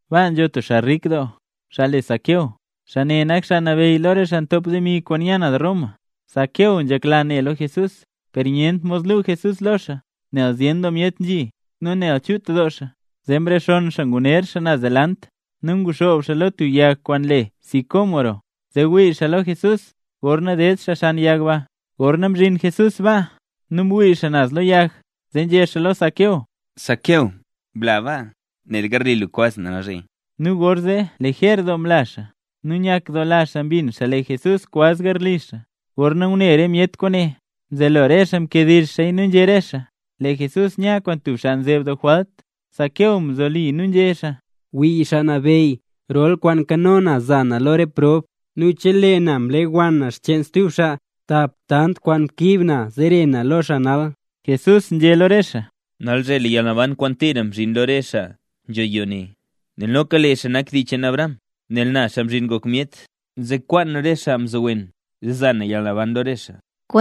Baa nzho tub xaa rik doo, xaa le Zaqueo, xaa ne nak xaa nabeyy lo re xaa ntop demi kwaan nya naz Roma. Zaqueo nzhekla ne lo Jesús; per nyent mod lu Jesús lo xaa, nel zyen doo myet nzhi, nu nel chut doo xaa. Zee mrexonn xaa nguner xaa naz delant nu nguxoob xaa lo tub yag kwaan le sicómoro, zee wii xaa lo Jesús gorna ded xaa xan yag ba. Gorna mzhin Jesús baa, nu mwii xaa naz lo yag zee nzhé xaa lo Zaqueo: —Zaqueo, bla baa, nel garli lu kwaz na nalzhe. Nu gorzee lejer doo mla xaa, nu nyakdoola xaa mbin xaa lee Jesús kwaz garli xaa. Gorna ngune re myet kwaane, mzelo re xaa mkediizh xaaya nu nzhé re xaa: —Lee Jesús nya kwaan tub xaa nzeeb doo jwalt. Zaqueo mzoli nu nzhé xaa: —Wii Xaa Nabeyy, rol re kwaan nkano na za na lo re xaa prob; nu chelee na mlewann na xcheen stub xaa, tap tant kwaan mkiib na lo xaa zere na lo xaa nal. Jesús nzhé lo re xaa: —Nalzhe lee yalnaban kwaan tira mzhin lo re xaa nzho yoo ne, nel noka lee xaa nak dii cheen Abraham. Nel na, Xaa Mzhin Ngok Myet, nzekwaan re xaa mzowen zee za na yalnaban lo re xaa.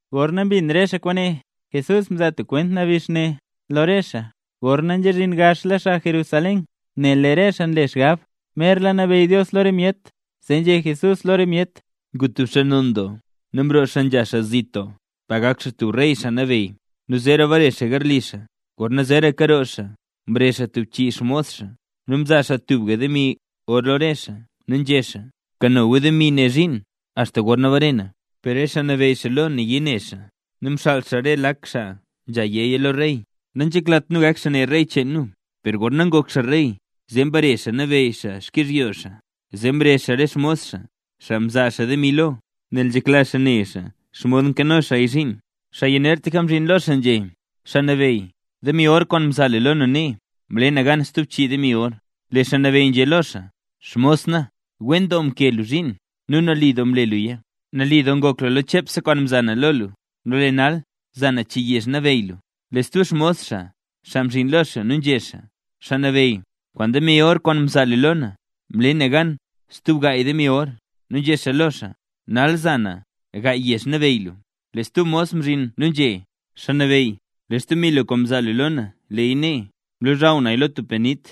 Gorna mbin xaa re kwaane, Jesús mzaa tub kwent nabix ne lo re xaa, gorna nzhazhin gaxla xaa Jerusalén, nel lee re xaa nle xgab merla nabeyy Dios lo re myet. Zee nzhé Jesús lo re myet: —Ngu tub xaa non doo, nu mroo xaa nzha xaa zit doo, pa gak xaa tub rey xaa nabeyy, nu zeera bare xaa garli xaa. Gorna zeeraka roo xaa, mrezh xaa tub chii xmos xaa, nu mzaa xaa tubga demi or lo re xaa nu nzhé xaa: “Bkano gu demi ne zhiin axta gorna bare na”. Per re xaa nabeyy xaa lo nayii ne xaa, nu mxaal re xaa lak xaa nzha yéya lo rey: “Nanzheklat nu gak xaa ne rey cheen nu”. Per gorna ngok xaa rey zee mbare xaa nabeyy xaa xkyizhyo xaa. Zee mrezh xaa re xmos xaa, xaa mzaa xaa demi lo, nel nzhekla xaa ne xomod mkano xaaya zhiin. Xaa yanertlaka mzhin lo xaa nzhé: “Xaa nabeyy, demi or kwaan mzaa lu lo na nee, mle na gan stub chii demi or”. Lee xaa nabeyy nzhé lo xaa: “Xmos na, wen doo mkee lu zhiin nu nali doo mle luya. Nali doo ngok lu lo chepse kwaan mza na lo lu, nu lee nal za na chii yezh nabeyy lu.” Lee stub xmos xaa mzhin lo xaa nu nzhé: “Xaa nabeyy, kwaan demi or kwaan mzaa lu lo na, mle na gan stub gaay demi or”. Nu nzhé xaa lo xaa: “Nal nza na gaay yezh nabeyy lu”. Lee stub mos mzhin nu nzhé: “Xaa nabeyy, lee xdemi lu kwaan mzaa lu lo na, leeya nee. Mlozhaw naya lo tub panit.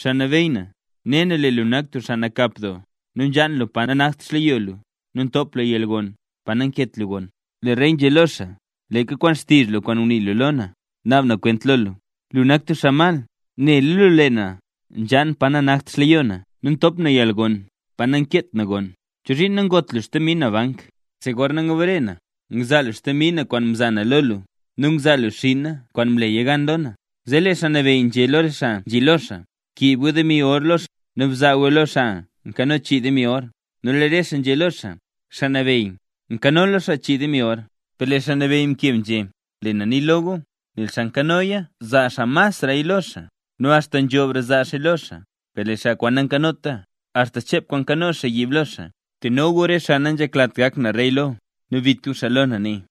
Xaa nabeyy na, ne na lee lu nak tub xaa nakap doo, nu nzhaan lu pa nanakt xleyo lu nu ntop lu yalgon pa nankeet lu goon.” Lee rey nzhé lo xaa: “Leeka kwaan xtizh lu kwaan ngunii lu lo na, naab na kwent lo lu; lu nak tub xaa mal. Néla lu lee na nzhaan pa nanakt xleyo na nu ntop na yalgon pa naket na goon. ¿Chozhiin nangoot lu xdemi na bank? Zee gorna ngbare na, ngzaa lu xdemi na kwaan mza na lo lu, nu ngzaa lu xinna kwaan mleya gan lo na.” Zee lee xaa nabeyy nzhé lo re xaa nzhi lo xaa: “Bkiib gu demi or lo xaa ne nu bzaa guya lo xaa nkano chii demi or”. Nu lee re xaa nzhé lo xaa: “Xaa nabeyy, nkanola xaa chii demi or”. Per lee xaa nabeyy mkeb nzhé: “Lee na nii lo gu: Nel xaa nkanoya zaa xaa masraya lo xaa, nu axta nzhobre zaa xaaya lo xaa. Per lee xaa kwaan nankanota axta chep kwaan nkano xaa yiib lo xaa. Teno gu re xaa nanzheklat gak na rey lo, nu bit gu xaa lo na nee.”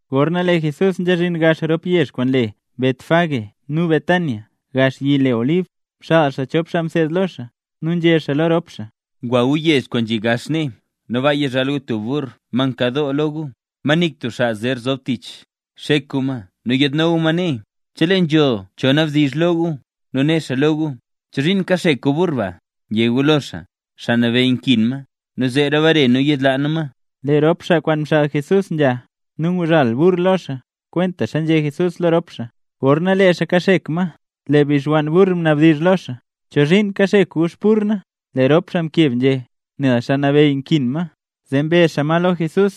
Gorna lee Jesús nzhazhin gax rop yezh kwaan le Betfagé nu Betania, gax yi le Olib, mxaal xaa chop xaa mseed lo xaa. Nu nzhé xaa lo rop xaa: —Gwa gu yezh kwaan nzhi gax nee, nu baa yizhal tub burr ma nkadoo lo gu, ma nik tub xaa zer zob tich. Xek gu ma nu yaadno gu ma nee. Chelee nzho cho nabdizh lo gu nu né xaa lo gu: “¿Chozhiin kaxek gu burr ba?” yé gu lo xaa: “Xaa Nabeyy nkin ma, nu zeera bare nu yiidlaa nu ma”. Lee rop xaa kwaan mxaal Jesús nzha, nu nguzhal xaa burr kwentaxa nzhé Jesús lo rop xaa. Gorna lee xaa kaxek ma, lee bixwann burr mnabdizh lo xaa: —¿Chozhiin kaxek gu xburr na? Lee rop xaa mkeb nzhé: —Nel Xaa Nabeyy nkin ma. Zee mbe xaa ma lo Jesús.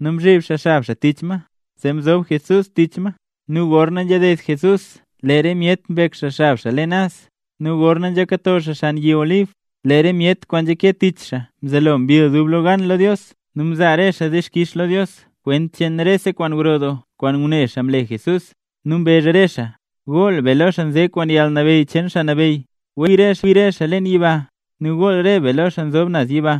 Nu mzhib xaa xab xaa tich ma, zee mzob Jesús tich ma. Nu gorna nzhaded Jesús lee re myet mbek xab leen naz. Nu gorna nzhakato xaa xan yi Olib, lee re myet kwaan nzhake tich xaa mzelo mbill dublegan lo Dios nu mzaa re xaa dixkix lo Dios kwent cheen rese kwaan gro doo kwaan ngune xaa mle Jesús. Nu mbezh re xaa: —¡Goll be lo xaa nze kwaan yalnabeyy cheen Xaa Nabeyy! ¡Wen kwi re xaa leen yiba nu gool re be lo xaa nzob naz yiba!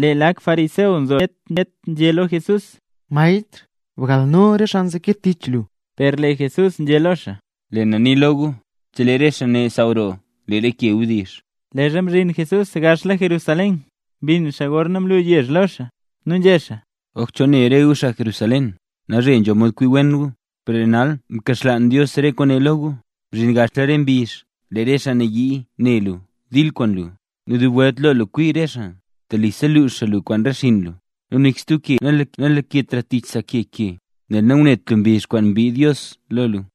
Lee lak fariseo nzo lo re myet nzhé lo Jesús: —Maestr, bgalno re xaa nzeke tich lu. Per lee Jesús nzhé lo xaa: —Lee na nii lo gu, chelee re xaa ne saaw roo lee re ke wdizh. Leezha mzhin Jesús gaxla Jerusalén, mbinn xaa gorna mlu yezh lo xaa. Nu nzhé xaa: —¡Oj chol ne re gu xaa Jerusalén, nalzhe nzho mod kwi wen gu, per lee nal mkaxlaan Dios re kwaane lo re gu! Mzhin gaxla re mbizh lee re xaa nayii ne lu dil kwaan lu, nu dub welt lo lu kwi re xaa. Telisa lux xaa lu kwaan re xinn lu, nu nik stub ke nalaketra tich sa ke ke, nel nangunet lu mbizh kwaan mbiid Dios lo lu.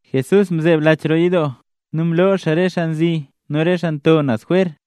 Jesús mzeeb lach roo yidoo, nu mloo xaa re xaa nzi nu re xaa nto naz jwer.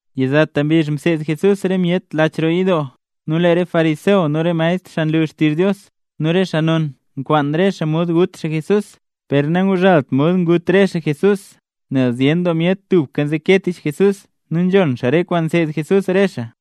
Yizata mbizh mseed Jesús re myet leen lach roo yidoo. Nu lee re fariseo nu re maestr xaa nlu xtizh Dios, nu re xaa non nkwaan re xaa mod gut xaa Jesús. Per nangazhaalt mod ngut re xaa Jesús, nel zyen doo myet tubka nzeke tich Jesús nu nzhon xaa re kwaan nseed Jesús re xaa.